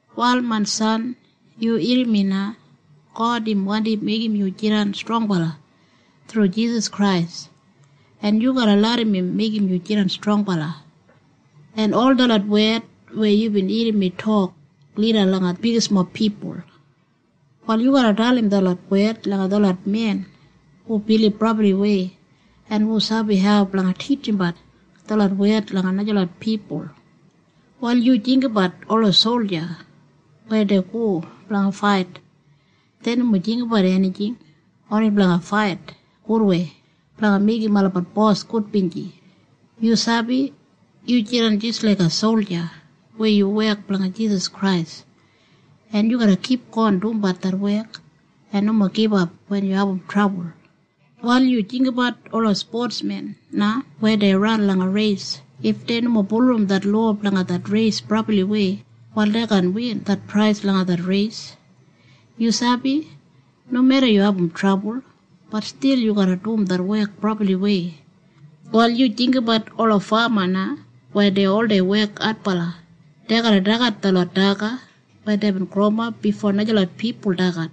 Wal main san, yu irrim mi na. God im wandi meigim yu jidan strongbala thru Jisas Krais, en yu garra larram im meigim yu jidan strongbala, en ol detlot wed weya yubin irrim mi tok lida langa bigismob pipul, wal yu garra dalim detlot wed langa detlot men hu bilib brabliwei en hu sabi hau blanga titjimbat detlot wed langa najalot pipul. Wal yu jinggabat ola solja weya dei go blanga fait. Dei nomo jinggabat enijing. Oni blanga fait gudwei blanga meigim olabat bos gudbinji. Yu sabi? Yu jidan jis laiga solja weya yu wek blanga Jisas Krais, en yu garra kipgon dumbat det wek en nomo gibap wen yu abum trabul. Wal yu jinggabat ola spotmen na weya dei ran langa reis. If dei nomo bulurrum det lowa blanga det reis brabliwei, wal dei kaan win det prais langa det reis. Yu sabi? Nomeda yu abum trabul, bat stil yu garra dum det wek brabliwei. Wal yu jinggabat ola fama na weya dei oldei wek adbala. Dei garra dagat detlot daga weya deibin growimap bifo najalot pipul dagat.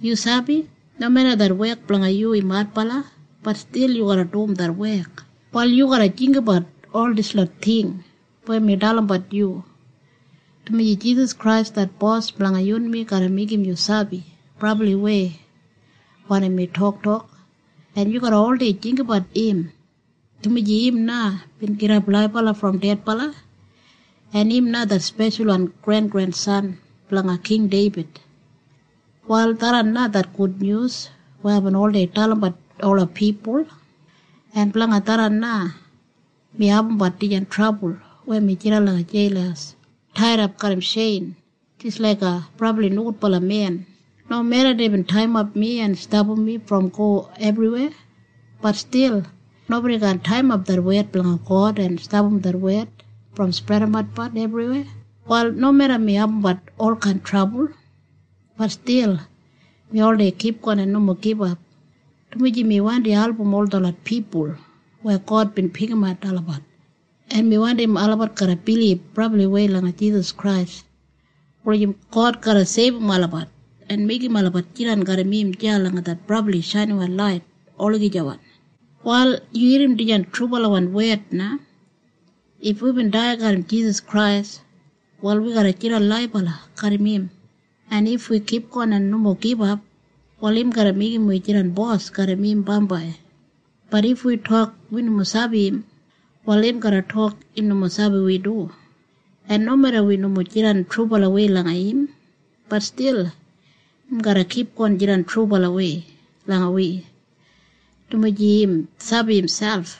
Yu sabi? Nomeda det wek blanga yu im adbala, bat stil yu garra dum det wek. Wal yu garra jinggabat ol dislot ting weya mi dalimbat yu, dumaji Jisas Krais det Bos blanga yunmi garra meigim yu sabi brabliwei wanim mi toktok. En yu garra oldei jinggabat im, dumaji im na bin gidap laibala brom dedbala, en im na det speshalwan grengrensan blanga King Deibid. Wal tharran na det gudnyus weya aibin oldei dalimbat ola pipul, en blanga tharran na mi abumbat dijan trabul weya mi jidan langa jeil taidap garram tjein jis laiga brabli nogudbala men. Nomeda deibin taiyimap mi en stapam mi brom go ebriweya, bat stil nobodi kaan taiyimap det wed blanga God en stapam det wed brom spredatbat ebriweya. Wal nomeda mi abumbat olkain trabul, bat stil mi oldei kipgon en nomo gibap, dumaji mi wandi album ol detlot pipul weya God bin pikimat olabat, en mi wandim olabat garra bilib brabliwei langa Jisas Krais wulijim God garra seibum olabat en meigim olabat jidan garram im deya langa det brabli shainiwan lait olagijawan. Wal yu irrim dijan trubalawan wed na. If wibin dai garram Jisas Krais, wal wi garra jidan laibala garram im. En if wi kipgon en nomo gibap, wal im garra meigim wi jidan bos garram im bambai. Bat if wi tok wi nomo sabi im, wal im garra tok im nomo sabi wi du. En nomeda wi nomo jidan trubalawei langa im, bat stil im garra kipgon jidan trubalawei langa wi, dumaji im sabi miselp.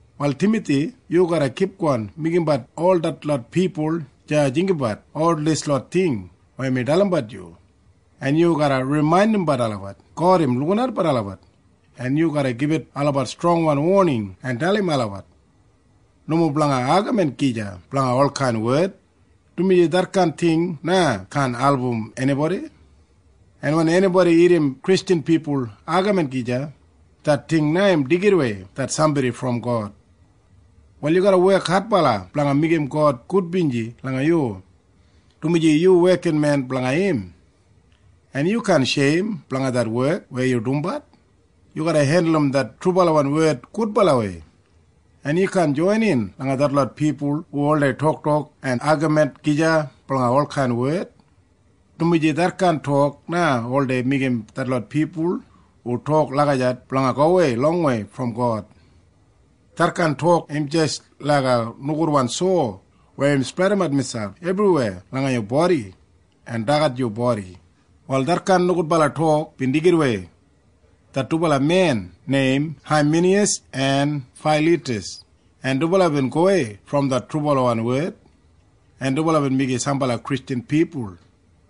Wal Timathi, yu garra kipgon meigimbat ol detlot pipul deya jinggabat ol dislot ting weya mi dalimbat yu, en yu garra rimaindimbat olabat, God im lukinatbat olabat, en yu garra gibit olabat strongwan woning en dalim olabat nomo blanga agamin gija blanga olkain wed, dumaji detkain ting na kaan album enibodi, en wen enibodi irrim Kristjan pipul agamin gija, det ting im deigidawei det sambodi brom God. Wal yu garra wek adbala blanga meigim God gudbinji langa yu, dumaji yu wekinmen blanga im, en yu kaan sheim blanga det wek weya yu dumbat. Yu garra hendulum det trubalawan wed gudbalawei, en yu kaan joinin langa detlot pipul hu oldei toktok en agamin gija blanga olkain wed, dumaji detkain tok na oldei meigim detlot pipul hu tok lagijat blanga gowei longwei brom God. Detkain tok im jis laiga nogudwan sowa weya im spredimat miselp ebriweya langa yu bodi en dagat yu bodi. Wal detkain nogudbala tok bin deigidawei det dubala men neim Haiminiyas en Failitas, en dubala bin gowei brom det trubalawan wed, en dubala bin meigim sambala Kristjan pipul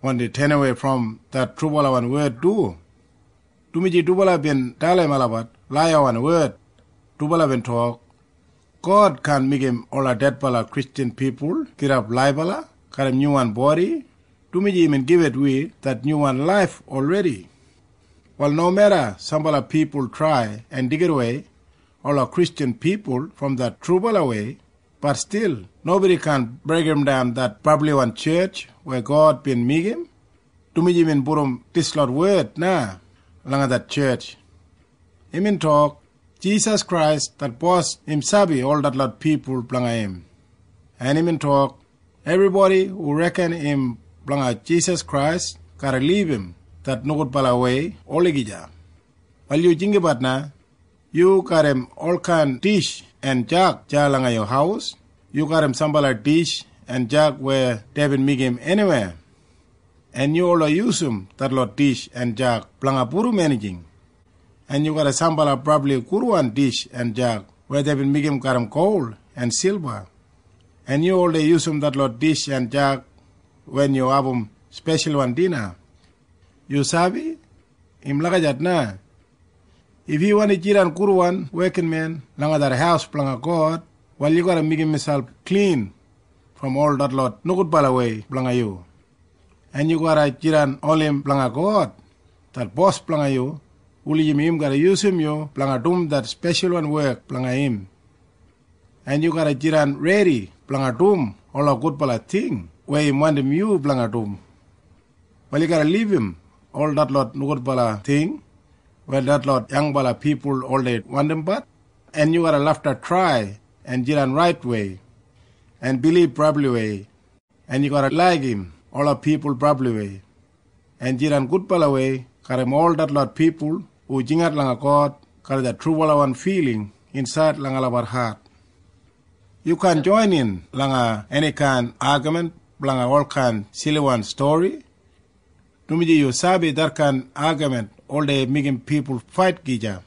wandi tenawei brom det trubalawan wed du, dumaji dubala bin dalim olabat laiyawan wed. Dubala bin tok, “God kaan meigim ola dedbala Kristjan pipul gidap laibala garram nyuwan bodi, dumaji imbin gibit wi det nyuwan laif olredi.” Wal nomeda sambala pipul trai en deigidawei ola Kristjan pipul brom det trubalawei, bat stil nobodi kaan breigimdan det brabliwan tjetj weya God bin meigim, dumaji imbin pudum dislot wed na langa det tjetj. Imbin tok, “Jisas Krais det Bos im sabi ol detlot pipul blanga im.” En imbin tok, “Ebribodi hu reken im blanga Jisas Krais garra libum det nogudbalawei olagija.” Wal yu jinggabat na. Yu garram olkain dish en jag deya langa yu haus. Yu garram sambala dish en jag weya deibin meigim eniwei, en yu oldei yusum detlot dish en jag blanga pudum enijing. En yu garram sambala brabli gudwan dish en jag weya deibin meigim garram gol en silba, en yu oldei yusum detlot dish en jag wen yu abum speshalwan dina. Yu sabi? Im lagijat na. If yu wandi jidan gudwan wekinmen langa det haus blanga God, wal yu garra meigim miselp klin brom ol detlot nogudbalawei blanga yu, en yu garra jidan oni blanga God det Bos blanga yu wulijim im garra yusum yu blanga dum det speshalwan wek blanga im, en yu garra jidan redi blanga dum ola gudbala ting weya im wandim yu blanga dum. Wal yu garra libum ol detlot nogudbala ting weya detlot yangbala pipul oldei wandimbat, en yu garra lafta trai en jidan raitwei, en bilib brabliwei, en yu garra laigim ola pipul brabliwei, en jidan gudbalawei garram ol detlot pipul hu jingat langa God garram det trubalawan filing insaid langa olabat hat. Yu kaan joinin langa enikain agamin blanga olkain siliwan stori, dumaji yu sabi detkain agamin oldei meigim pipul fait gija.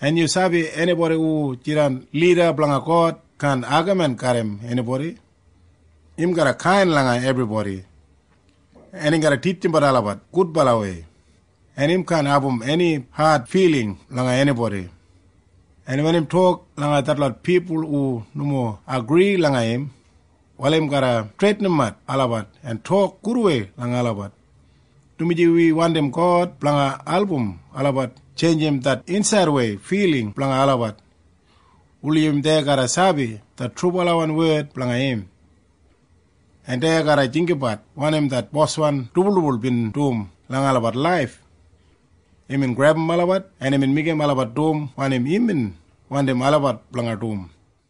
En yu sabi enibodi hu jidan lida blanga God kaan agamin garram enibodi. Im garra kain langa ebribodi, en im garra titjimbat olabat gudbalawei, en im kaan abum eni ad filing langa enibodi, en wen im tok langa detlot pipul hu nomo agri langa im, wal im garra streitinimap olabat en tok gudwei langa olabat. Dumaji wi wandim God blanga album olabat tjeinjim det insaidwei filing blanga olabat wulijim dei garra sabi det trubalawan wed blanga im, en dei garra jinggabat wanim det boswan dibuldibul bin dum langa olabat laif. Imbin grebum olabat, en imbin meigim olabat dum wanim imbin wandim olabat blanga dum.